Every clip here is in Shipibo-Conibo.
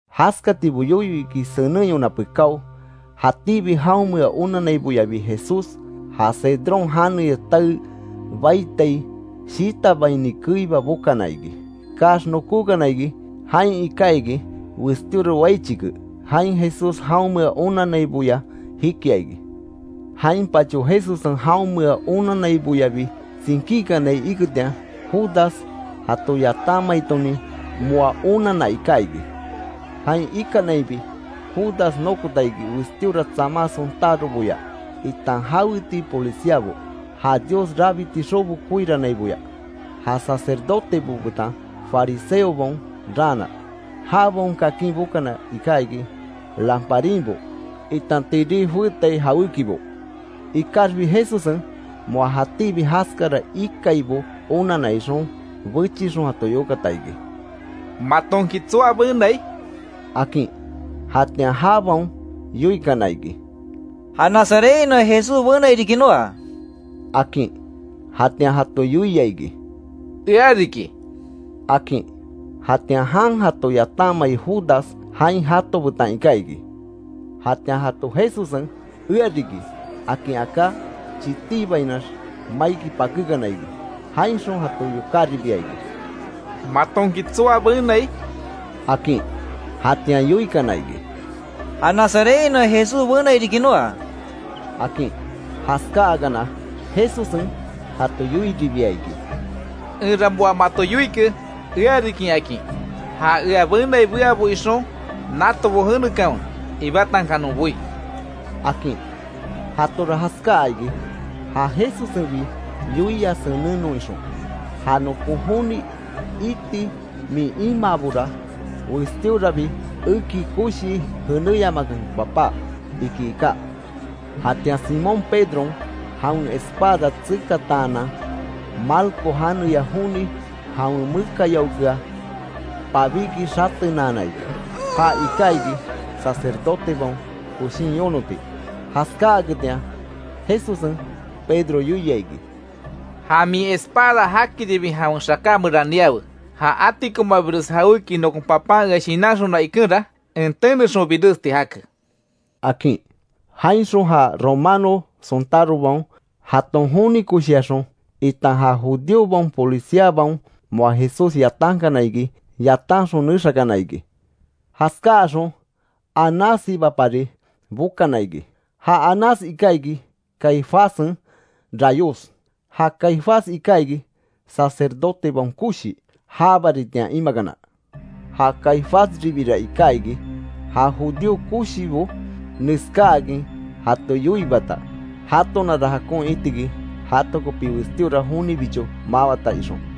Jaskatibo yoyo iki senenyona pekáo, jatíbi jaonmea onanaiboyabi Jesús, ja Cedrón janeya tae baitai shitabaini keiba bokana iki. Kaax nokókana iki, jain iká iki westíora wai chike, jain Jesús jaonmea onannaiboya jikia iki. Jainpacho Jesussen jaonmea onanaiboyabi tsinkíkinai iketian, Judas jato yatanmaitonin moa onanna iká iki. Jain ikanaibi Judas nokota iki westíora tsama sontároboya itan jawetii policiabo, ja Dios rabiti xobo koiranaiboya; ja sacerdotebo betan fariseobaon raana, jabaon kakin bokana iká iki, lamparinbo itan tirí joétai jawékibo. Ikaxbi Jesussen moa jatíbi jaskara ikaibo onanna ixon, bechixon jato yokata iki: —¿Matonki tsoa benai? —akin. Jatian jabaon yoikana iki: —Ja Nazarethainoa Jesús benai riki noa —akin. Jatian jato yoia iki: —Ea riki —akin. Jatian jan jato yatanmai Judas jain jato betan iká iki. Jatian jato Jesussen “Ea riki”, akin aká, chitíbainax maiki pakékana iki. Jainxon jato yokáribia iki: —¿Matonki tsoa benai? —akin. Jatian yoikana iki: —Ja Nazarethainoa Jesús benai riki noa —akin. Jaskáakana, Jesussen jato yoiribia iki: —Enra moa mato yoike ea riki akin. Ja ea benai beabo ixon, natobo jenekanwe ibátankanon boí —akin. Jatora jaskáa iki, ja Jesussenbi yoia senennon ixon: “Ja nokon joni iti min imaabora, westíorabi eki koshii jenéyamakanke Papá”, iki iká. Jatian Simón Pedron, jawen espada tsekataanan, Malco janeya joni jawen mekayaokea pabíki xatenaana iki, ja iká iki sacerdotebaon koshin yonoti. Jaskáaketian Jesussen Pedro yoia iki: —Ja min espada jakiribi jawen xaká meran niawe. Ja atikomabires jawéki nokon Papan ea shinanxona ikenra, en tenexon biresti jake —akin. Jainxon ja romano sontárobaon, jaton joni koshiaxon, itan ja judíobaon policiabaon moa Jesús yatankana iki yatanxon nexakana iki. Jaskáaxon Anássibapari bokana iki. Ja Anás iká iki Caifássen rayos. Ja Caifás iká iki, sacerdotebaon koshi, ja baritian imakana. Ja Caifásribira iká iki, ja judío koshibo neskáakin jato yoiibata, jatonara jakon itiki jato kopi westíora jonibicho mawata ixon.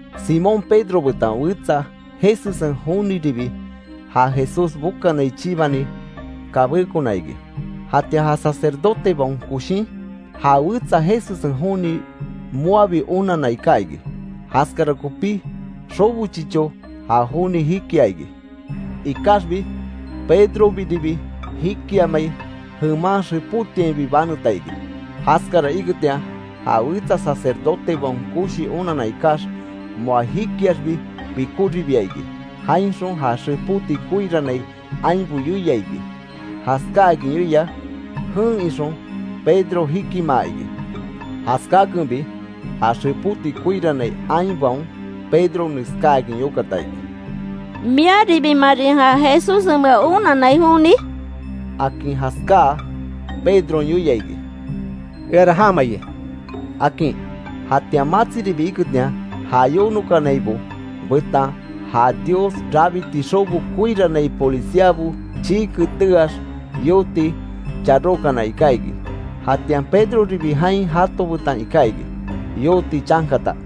Simón Pedro betan wetsa Jesussen joniribi, ja Jesús bokanai chibani kabékona iki. Jatian ja sacerdotebaon koshin, ja wetsa Jesussen joni moabi onanna iká iki. Jaskara kopí, xobo chicho ja joni jikia iki. Ikaxbi Pedrobiribi jikiamai, jeman xepótiainbi baneta iki. Jaskara iketian ja wetsa sacerdotebaon koshi onanna ikax, moa jikiaxbi pikoribia iki, jainxon ja xepóti koirannai ainbo yoia iki, jaskáakin yoia, jen ixon, Pedro jikimaa iki. Jaskakenbi ja xepóti koirannai ainbaon Pedro neskáakin yokata iki: —¿Miaribimarin ja Jesussenmea onanai joni? —akin. Jaskáa Pedron yoia iki: —Eara jama iki —akin. Jatian matsiribi iketian, ja yonokanaibo betan ja Dios rabiti xobo koirannai policiabo chii keteaax yooti charókana iká iki. Jatian Pedroribi jain jato betan iká iki, yooti chankata.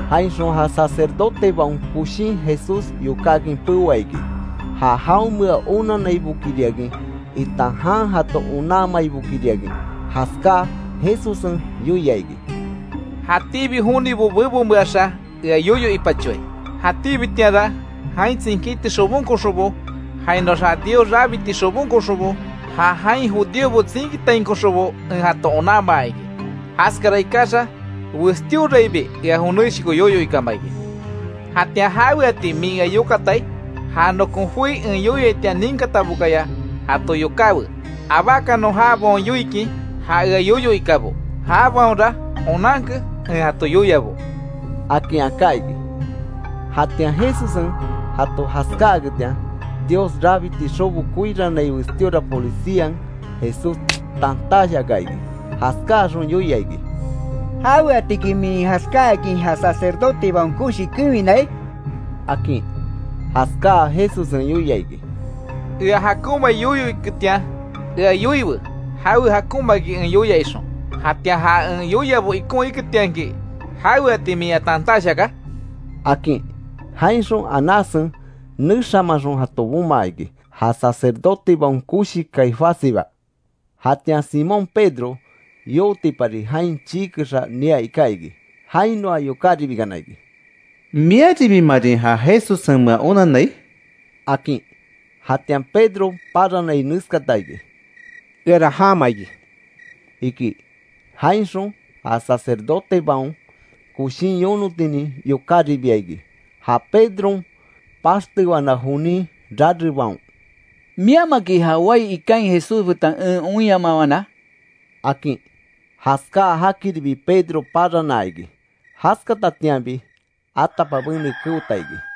Jainxon, ja sacerdotebaon koshin Jesús yokákin peoa iki, ja jaonmea onanaibokiriakin itan jan jato onanmaibokiriakin. Jaskáa Jesussen yoia iki: —Jatíbi jonibo bebonmeaxa ea yoyo ipachoai, jatíbitianra jain tsinkíti xobonkoxonbo, jainoax ja Dios rabiti xobonkoxonbo ja jain judíobo tsinkitainkoxonbo en jato onanmaa iki; jaskara ikaxa westíoraibi ea joneshoko yoyo ikama iki. ¿Jatian jaweatiki min ea yokatai? Ja nokon joi en yoiaitian ninkatabokaya jato yokáwe, abákanon jabaon yoikin, ja ea yoyo ikabo, jabaonra onankanke en jato yoiabo —akin aká iki. Jatian Jesussen jato jaskáaketian, Dios rabiti xobo koirannai westíora polician Jesús tantash aka iki, jaskáaxon yoia iki: —¿Jaweatiki min jaskáakin ja sacerdotebaon koshi kewinai? —akin. Jaskáa Jesussen yoia iki: —Ea jakonmai yoyo iketian ea yoiwe, jawe jakonmaki en yoia ixon, jatian ja en yoiabo ikon iketianki ¿Jaweati min ea tantash aka? —akin. Jainxon Anássen, nexamaxon jato bomaa iki, ja sacerdotebaon koshi Caifássiba. Jatian Simón Pedro yotipari jain chii kexa nia iká iki. Jainoa yokáribikana iki: —¿Miaribimarin ja Jesussenmea onanai? —akin. Jatian Pedro paranai neskata iki: —Eara jaama iki —iki. Jainxon ja sacerdotebaon koshin yonotinin yokáribia iki, ja Pedron paxtewana jonin rarebaon: —¿Miamaki ja wai ikain Jesús betan en oinyamawana? —akin. Jaskáa jakiribi Pedron paranaa iki, jaskatatianbi atapabene keota iki.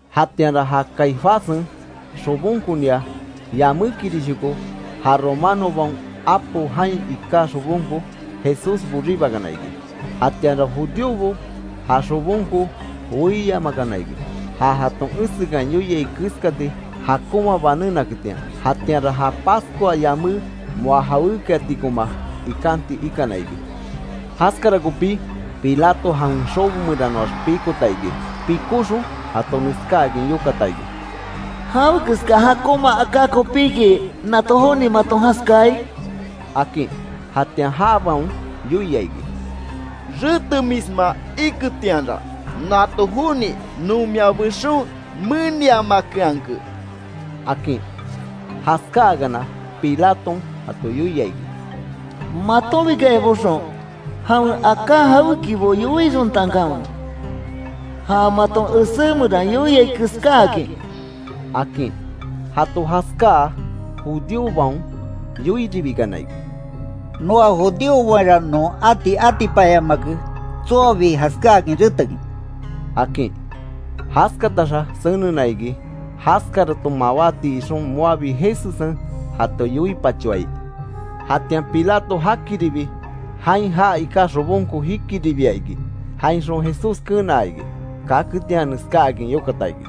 Jatianra ja Caifássen xobonkonia, yamékirishoko ja romanobaon apo jain iká xobonko, Jesús boribakana iki, jatianra judíobo ja xobonko weiyamakana iki, ja jaton esekan yoiai keskati jakonma banénaketian, jatianra ja Pascua yamé moa jawékiatikoma ikanti ikana iki. Jaskara kopí, Pilato jawen xobo meranoax pikota iki, pikóxon jato neskáakin yokata iki: —¿Jawekeska jakonma aká kopíki nato joni maton jaskai? —akin. Jatian jabaon yoia iki: —Retemisma iketianra, nato joni non mia bexon meniamakeanke —akin. Jaskáakana, Pilaton jato yoia iki: —Matonbikaya boxon, jawen aká jawékibo yoixontankanwe, ja maton esé meran, yoiai keskáakin —akin. Jato jaskáa, judíobaon yoiribikana iki: —Noa judíobaonra non ati atipanyamake, tsoabi jaskáakin retekin —akin. Jaskataxa senena iki, jaskaraton mawáti ixon moabi Jesussen jato yoipachoai. Jatian Pilato jakiribi, jain já iká xobonko jikiribia iki, jainxon Jesús kenaa iki kaketian neskáakin yokata iki: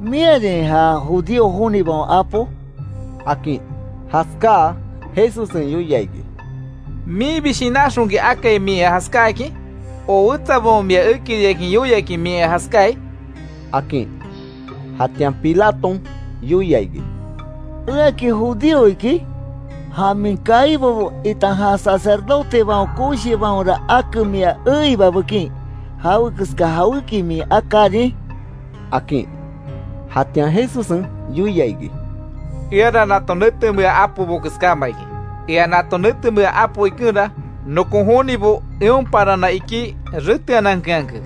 —¿Miarin ja judío jonibaon Apo? —akin. Jaskáa, Jesussen yoia iki: —¿Minbi shinanxonki akai min ea jaskáakin? o ¿Wetsabaon mia ekiriakin yoiaki min ea jaskáai? —akin. Jatian Pilaton yoia iki: —¿Eaki judío iki? Ja min kaibobo, itan ja sacerdotebaon koshibaonra ake mia eiba bekin ¿Jawekeska jawéki min akárin? —akin. Jatian Jesussen yoia iki: —Eara nato netemea apobo keskáma iki, ea nato netemea apo ikenra, nokon jonibo eon paranan ikí reteanankeanke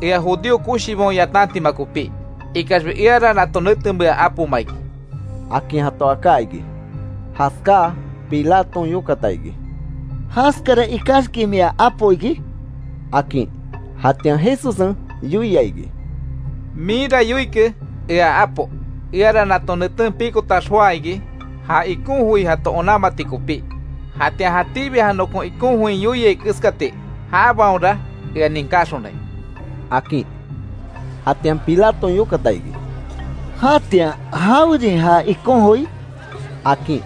ea judío koshibaon yatantima kopí. Ikaxbi eara nato netemea apoma iki —akin jato aká iki. Jaskáa Pilaton yokata iki: —¿Jaskara ikaxki mia apo iki? —akin. Jatian Jesussen yoia iki: —Minra yoike, ea apo. Eara nato neten pikotax joá iki, ja ikon joi jato onanmati kopí. Jatian jatíbi ja nokon ikon join yoiai keskati jabaonra ea ninkaxonai —akin. Jatian Pilaton yokata iki: —¿Jatian jawerin ja ikon joi? —akin.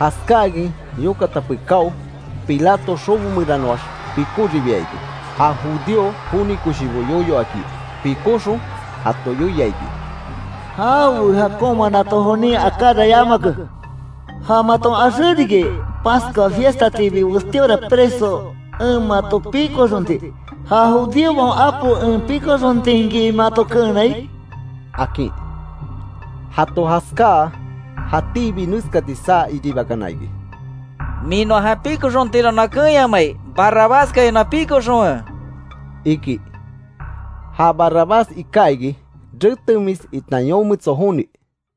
Jaskáakin yokata pekáo, Pilato xobo meranoax pikoribia iki, ja judío joni koshibo yoyo aki. Pikóxon, jato yoia iki. —Jawe jakonma nato jonin akára yamake. Ja maton axé riki, Pascua fiestatiibi westíora preso en mato pikoxonti. ¿Ja judíobaon Apo en pikoxontinki mato keenai? —akin. Jato jaskáa, jatíbi neskati saa iribakana iki: —¡Min noa já pikoxontinra noa keenyamai! ¡Barrabaskaya noa pikoxonwe! —iki. Ja Barrabás iká iki retemis itan yometso joni.